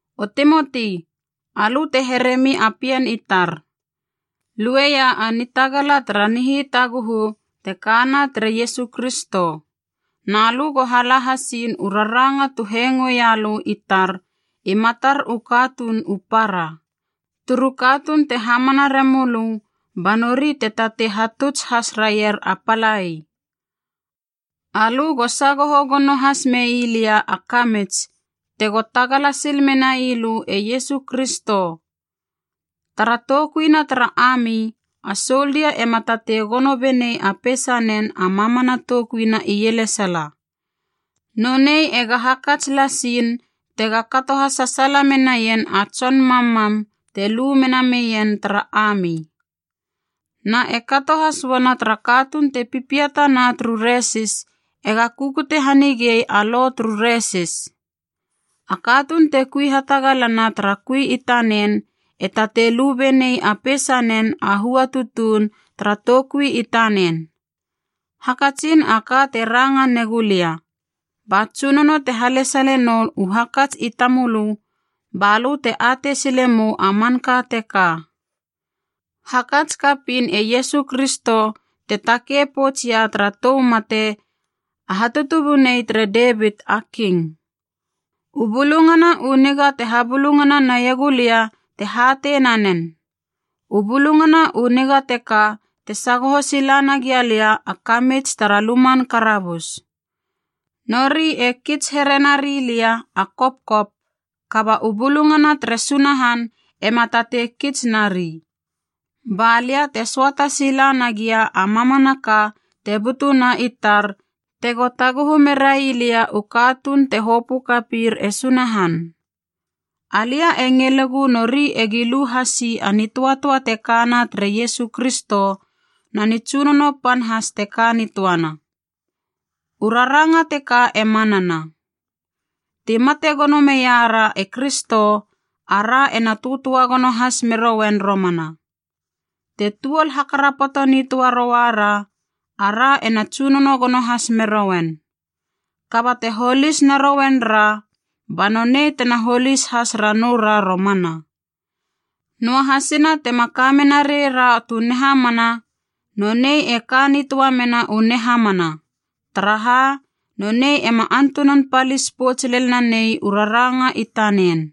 O Timoti alö te heremi a pien i tar, lueia a nitagala tara nihitaguhu te kana tere Iesu Kristo. Na lö go hala hasiin u raranga tu hengoeia lö i tar i matar u katuun u para, turu katuun te hamana remölö, ba nori te tatei hatuts has raier a palai. Alö go sagoho gono has mei lia a kamits, tego tagala sil menai lö e Iesu Kristo. Tara toukuina tara ami, a soldia ema tatei gono benei a peisanen a mamana toukuina ielesala. Nonei ega hakats lasiin tega kato hasasaala menaien a tson mammam te lu mena meien tara ami. Na e kato has uana tara katuun te pipiatana turu resis, ega kukute hanigei a lo turu resis. A katuun te kui hatagalana tara kui i tanen e tatei lu benei a peisanen a hua tutuun tara toukui i tanen. Hakatsin a ka te ranga ne gulia, ba Tsunono te halesale nou u hakats i tamölö ba lö te atei sile mou a manka teka. Hakats kapiin e Iesu Kristo te takei poutsia tara tou mate, a hatutubunei tere Devit a King. U Bulungana u Niga te habulungana naiegulia te hatei nanen. U Bulungana u Niga teka te sagoho sila nagia lia a kamits tara luman karabus. Nori e kits here nari lia a kopkop, kaba u bulungana tere Sunahan ema tatei kits nari. Ba lia te söata sila nagia a mamanaka te butuna i tar tego taguhu merai lia u katuun te hopö kapir e Sunahan. Alia e ngilegu nori egi lu hasi a nitöatöa te kana tere Iesu Kristo, na nitsunono pan has te ka nitöana. U raranga teka e manana: Ti mate gono meia ra e Kristo, a ra ena töatöa gono has merouen romana. Te tuol hakarapoto nitöa roua ra, a ra ena tsunono gono has merouen. Kaba te holis narouen ra, ba nonei tena holis has ranou ra romana. Noahasina tema kamena reira tu nihamana, nonei e ka nitöa mena u nihamana, taraha nonei ema antunan palis pouts lel nanei u raranga i tanen.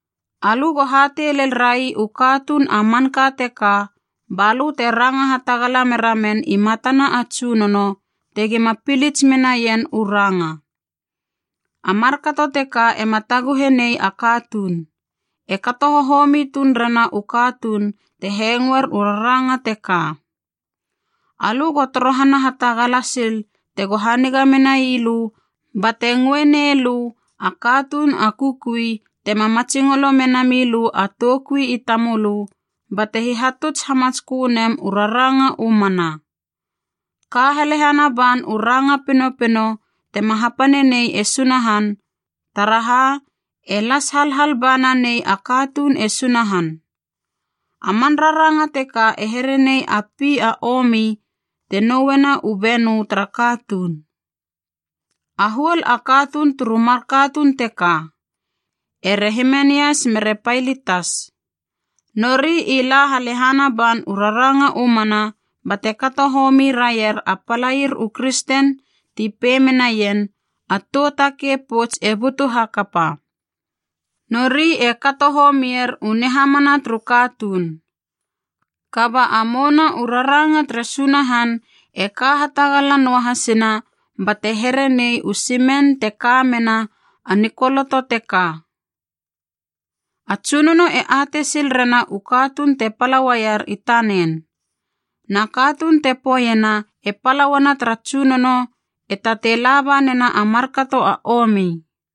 Alö go hatei lel rai u katuun a manka teka balö te ranga hatagala meramen i matana a Tsunono tegima pilits menaien u ranga. A markato teka ema taguhe nei a katuun, e kato hohomi tuun rena u katuun te hengoer u raranga teka. Alö go torohana hatagala sil tego haniga menai lö e Sunahan bate ngöe nei lö a katuun a kukui tema matsingolo mena milö a toukui i tamölö bate hihatuts hamatskö nem u raranga u mana. Ka halehana ban u ranga pinopino tema hapanenei e Sunahan, taraha e las halhal ba nanei a katuun e Sunahan. A man raranga teka e here nei a pi a omi te nouena u benö tara katuun. A huol a katuun turu mar katuun teka, ere Himenias mere Pailitas. Nori i la halehana ban u raranga u mana bate kato homi raier a palair u kristen ti pei menaien, a tou takei pouts e butu hakapa. Nori e kato homier u nihamana turu katuun. Kaba a mouna u raranga tere Sunahan e ka hatagala noa hasina bate here nei u simen te ka mena a nikoloto teka: “A Tsunono e atei sil rena u katuun te pala uaier i tanen. Na katuun te poeiena e pala uana tara Tsunono e tatei laba nena a markato a omi.”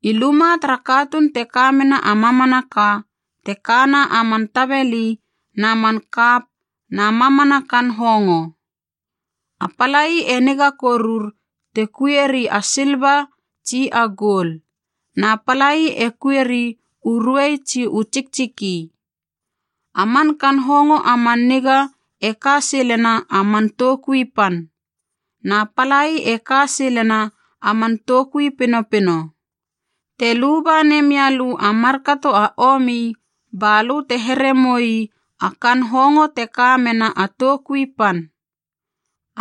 I luma tara katuun te ka mena a mamanaka, te kana a man tabeli na man kap na mamana kaan hongo. A palai e niga korur te kuieri a silva tsi a goul, na palai e kuieri u ruei tsi u tsiktsiki. A man kaan hongo a man niga e ka silena a man toukui pan, na palai e ka silena a man toukui pinopino. Te luba nemia lö a markato a omi, ba lö te here moi a kaan hongo te ka mena a toukui pan.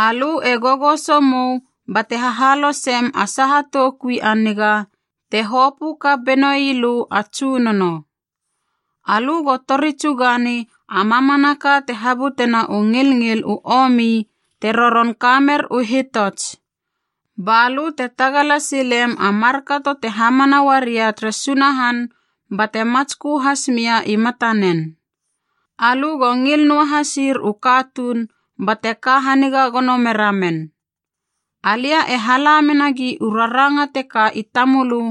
Alö e gogoso mou bate hahalosem a saha toukui a niga te hopö kap benoi lö a Tsunono. Alö go tori tsugani a mamanaka te habutena u ngilngil u omi te roron kamer u hitots, ba lö te tagala silem a markato te hamana uaria tere Sunahan bate matskö has mia i matanen. Alö go ngil noa hasir u katuun bate ka haniga gono mera men. Alia e hala menagi u raranga teka i tamölö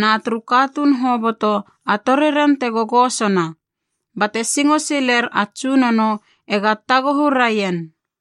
na turu katuun hoboto a toriren te gogosona, bate singo siler a Tsunono ega taguhu raien.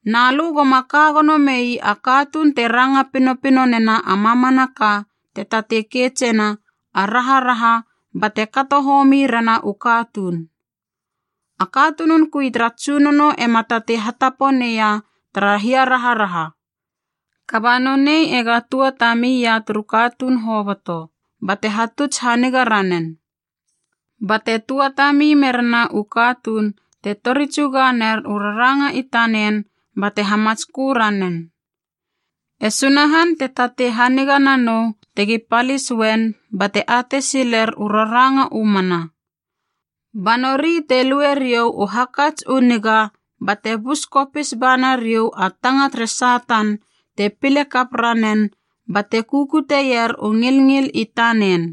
Na lö goma ka gono mei a katuun te ranga pinopino nena a mamanaka te tatei keitsena a raharaha bate kato homi rena u katuun. A katunun kui tara Tsunono ema tatei hatapo neia tara hiaraharaha, kaba nonei ega tua tami ia turu katuun hoboto, bate hatuts haniga ranen. Bate tuatami merena u katuun te tori tsuga ner u raranga i tanen bate hamatskö ranen. E Sunahan te tatei haniga nanou tegi palis uen bate atei siler u raranga u mana. Ba nori te lue riou u hakats u niga bate bus kopis ba nariou a tanga tere Satan te pile kap ranen bate kukutieier u ngilngil i tanen.